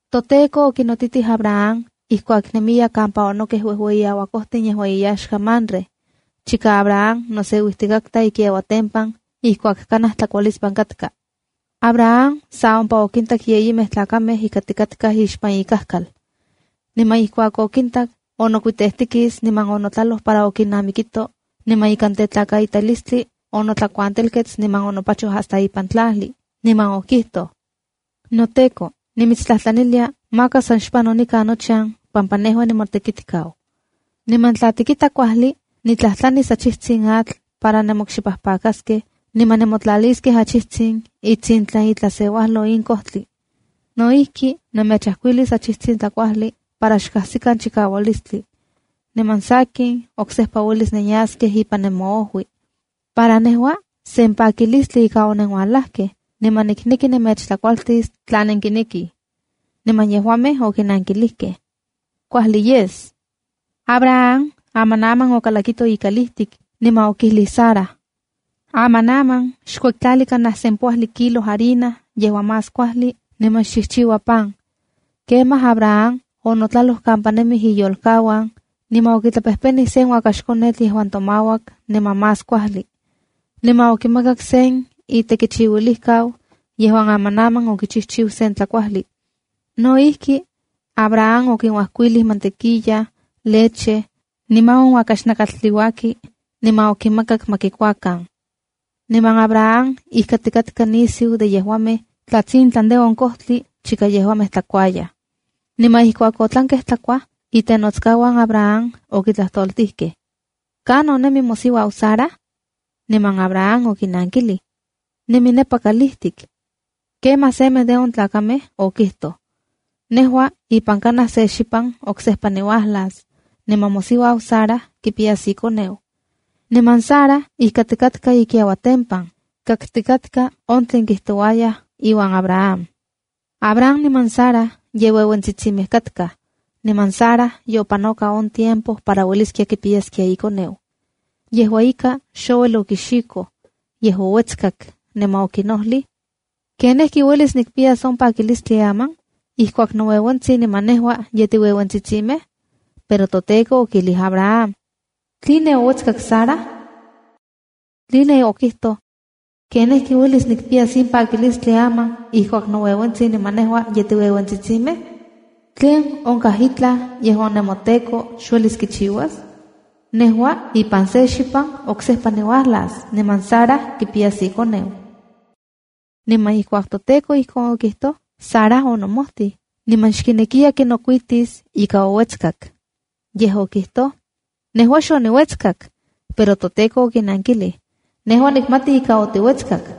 ToTEKO okinotitij Abraham ijkuak nemiya kampa onokej uejueyi auakojtin yejuan iyaxka Mamre, chika Abraham noseuijtikatka ikiauatempan ijkuak kanaj tlakualispan katka. Abraham sa ompa okintak yeyimej tlakamej ijkatikatkaj ixpan ikajkal. Niman ijkuak okintak, onokuitejtikis niman onotlaloj para okinnamikito niman ikan tetlakaitalistli onotlakuantelkets niman onopachoj hasta ipan tlajli, niman okijtoj: —NoTEKO, nimitstlajtlanilia, maka san xpano nikan nochan pampa nejua nimotekitkau. Niman tla tikita kuajli, nitlajtlanis achijtsin atl para nenmokxipajpakaskej, niman nemotlaliskej achijtsin itsintlan itlaseuajlo in kojtli. No ijki, nemechajkuilis achijtsin tlakuajli para xkajsikan chikaualistli, niman sakin, oksejpa uelis nenyaskej ipan nemojui. Para nejua, sen pakilistli ika onenuajlajkej, niman nikneki nemechtlakualtis tla nenkinekij. Niman yejuamej okinankilijkej: —Kuajli yes. Abraham amanaman okalakito ikalijtik, niman okijlij Sara: —Amanaman xkuektlali kanaj sempoajli kilos harina yejuan más kuajli, niman xchijchiua pan. Kemaj Abraham onotlaloj kampa nemij iyolkauan, niman okitlapejpenij sen uakaxkonetl yejuan tomauak niman más kuajli. Niman okimakak se itekichiuilijkau, yejuan amanaman okichijchiu sen tlakuajli. No ijki, Abraham okinuajkuilij mantequilla, leche, niman on uakax nakatl tliuaki, niman okinmakak ma kikuakan. Niman Abraham ijkatikatka nisiu de yejuamej tlatsintlan de on kojtli chika yejuamej tlakuayaj. Niman ijkuak otlankej tlakuaj, itenotskauan Abraham okitlajtoltijkej: —¿Kanon nemi mosiuau Sara? Niman Abraham okinankilij: —Nemi nepa kalijtik. Kemaj semej de on tlakamej okijtoj: —Nejua ipan kanaj se xipan oksejpa niuajlas, niman mosiuau Sara kipiyas ikoneu. Niman Sara ijkatikatka ikiauatempan, kaktikatka on tlen kijtouayaj iuan Abraham. Abraham niman Sara ye ueuentsitsimej katkaj, niman Sara yopanoka on tiempo para ueliskia kipiyaskia ikoneu. Yejua ika, xouel okixikoj, yej ouetzkak niman okinojlij: “¿Kenijki uelis nikpiyas on pakilistli aman, ijkuak noueuentsin niman nejua ye tiueuentsitsimej?” Pero toTEKO okijlij Abraham: —¿Tline ouetskak Sara? Tline okijtoj: ¿Kenijki uelis nikpiyas in pakilistli aman ijkuak noueuentsin niman nejua ye tiueuentsitsimej? ¿Tlen onkaj itlaj yejuan nemoTEKO, xuelis kichiuas? Nejua ipan se xipan oksejpa niuajlas niman Sara kipiyas ikoneu. Niman ijkuak toTEKO ijkon okijtoj, Sara onomojtij, niman xkinekiya kinokuitis ika ouetskak. Yej okijtoj: —Nejua xoniuetskak. Pero toTEKO okinankilij: —Nejua nikmati ika otiuetskak.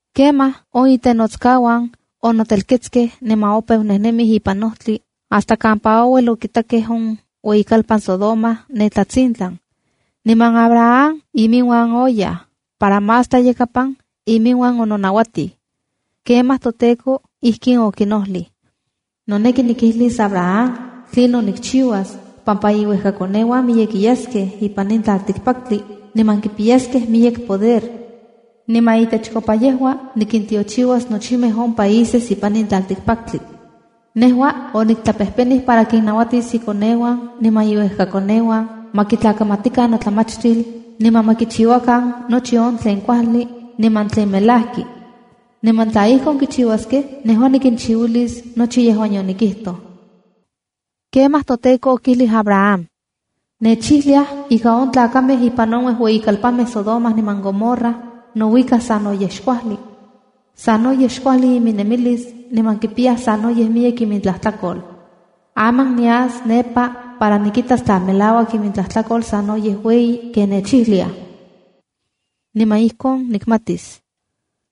Kemaj on itenotskauan onotelketskej niman opeu nejnemij ipan ojtli hasta kampa ouel okitakej on ueyikalpan Sodoma ne tlatsintlan. Niman Abraham iminuan oyaj para más tlayakapan iminuan ononauatij. Kemaj toTEKO ijkin okinojlij: “Noneki nikijlis Abraham tlinon nikchiuas, pampa iuejkakoneuan miyekiyaskej ipan in tlaltikpaktli niman kipiyaskej miyek poder. Niman itechkopa yejua nikintiochiuas nochimej on países ipan in tlaltikpaktli. Nejua oniktlapejpenij para kinnauatis ikoneuan niman iuejkakoneuan ma kitlakamatikan notlamachtil, niman ma kichiuakan nochi on tlen kuajli niman tlen melajki. Niman tla ijkon kichiuaskej, nejua nikinchiuilis nochi yejuan yonikijtoj.” Kemaj toTEKO okijlij Abraham: —Nechijliaj ika on tlakamej ipan on uejueyikalpanmej Sodoma niman Gomorra nouikaj sanoyej xkuajli. Sanoyej xkuajli iminnemilis niman kipiyaj sanoyej miyek imintlajtlakol. Aman nias nepa para nikitas tla melauak imintlajtlakol sanoyej ueyi ken nechijliaj. Niman ijkon nikmatis.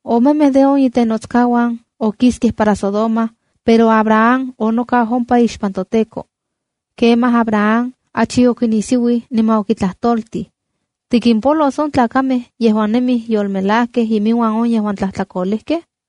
Omemej de on itenotskauan okiskej para Sodoma, pero Abraham onokau ompa ixpan toTEKO. Kemaj Abraham achi okinisiuij niman okitlajtoltij: —¿Tikimpolos on tlakamej yejuan nemij yolmelajkej iminuan on yejuan tlajtlakolejkej?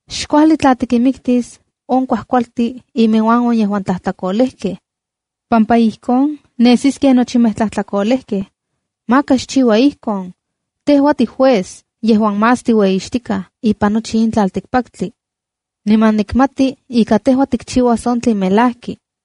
Xkuajli tla tikinmiktis on kuajkualtin iminuan on yejuan tlajtlakolejkej, pampa ijkon nesis ken nochimej tlajtlakolejkej. ¡Maka xchiua ijkon! Tejua tijuez yejuan más tiueyixtikaj ipan nochi in tlaltikpaktli, niman nikmati ika tejua tikchiuas on tlen melajki.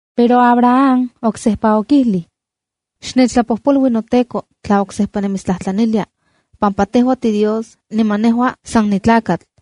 Pero Abraham oksejpa okijlij: —Xnechtlapojpolui noTEKO tla oksejpa nimitstlajtlanilia, pampa tejua tiDios niman nejua san nitlakatl.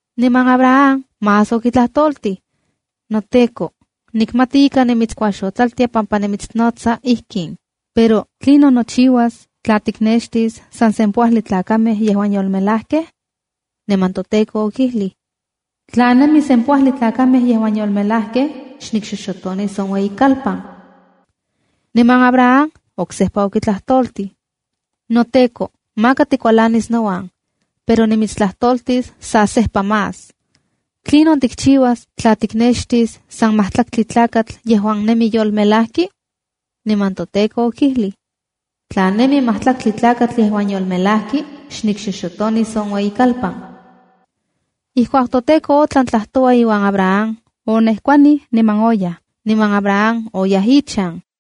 Niman Abraham más okitlajtoltij: —NoTEKO, nikmati ika nimitskuaxotlaltia pampa nimitsnotsa ijkin, pero ¿tlinon nochiuas tla tiknextis san sempoajli tlakamej yejuan yolmelajkej? Niman toTEKO okijlij: —Tla nemi sempoajli tlakamej yejuan yolmelajkej, xnikixoxotonis on ueyikalpan. Niman Abraham oksejpa okitlajtoltij: —NoTEKO, maka tikualanis nouan, pero nimitstlajtoltis sa sejpa más: ¿Tlinon tikchiuas tla tiknextis san majtlaktli tlakatl yejuan nemi yolmelajki? Niman toTEKO okijlij: —Tla nemi majtlaktli tlakatl yejuan yolmelajki, xnikxoxotonis on ueyikalpan. Ijkuak toTEKO otlan tlajtoua iuan Abraham, onejkuanij niman oyaj. Niman Abraham oyaj ichan.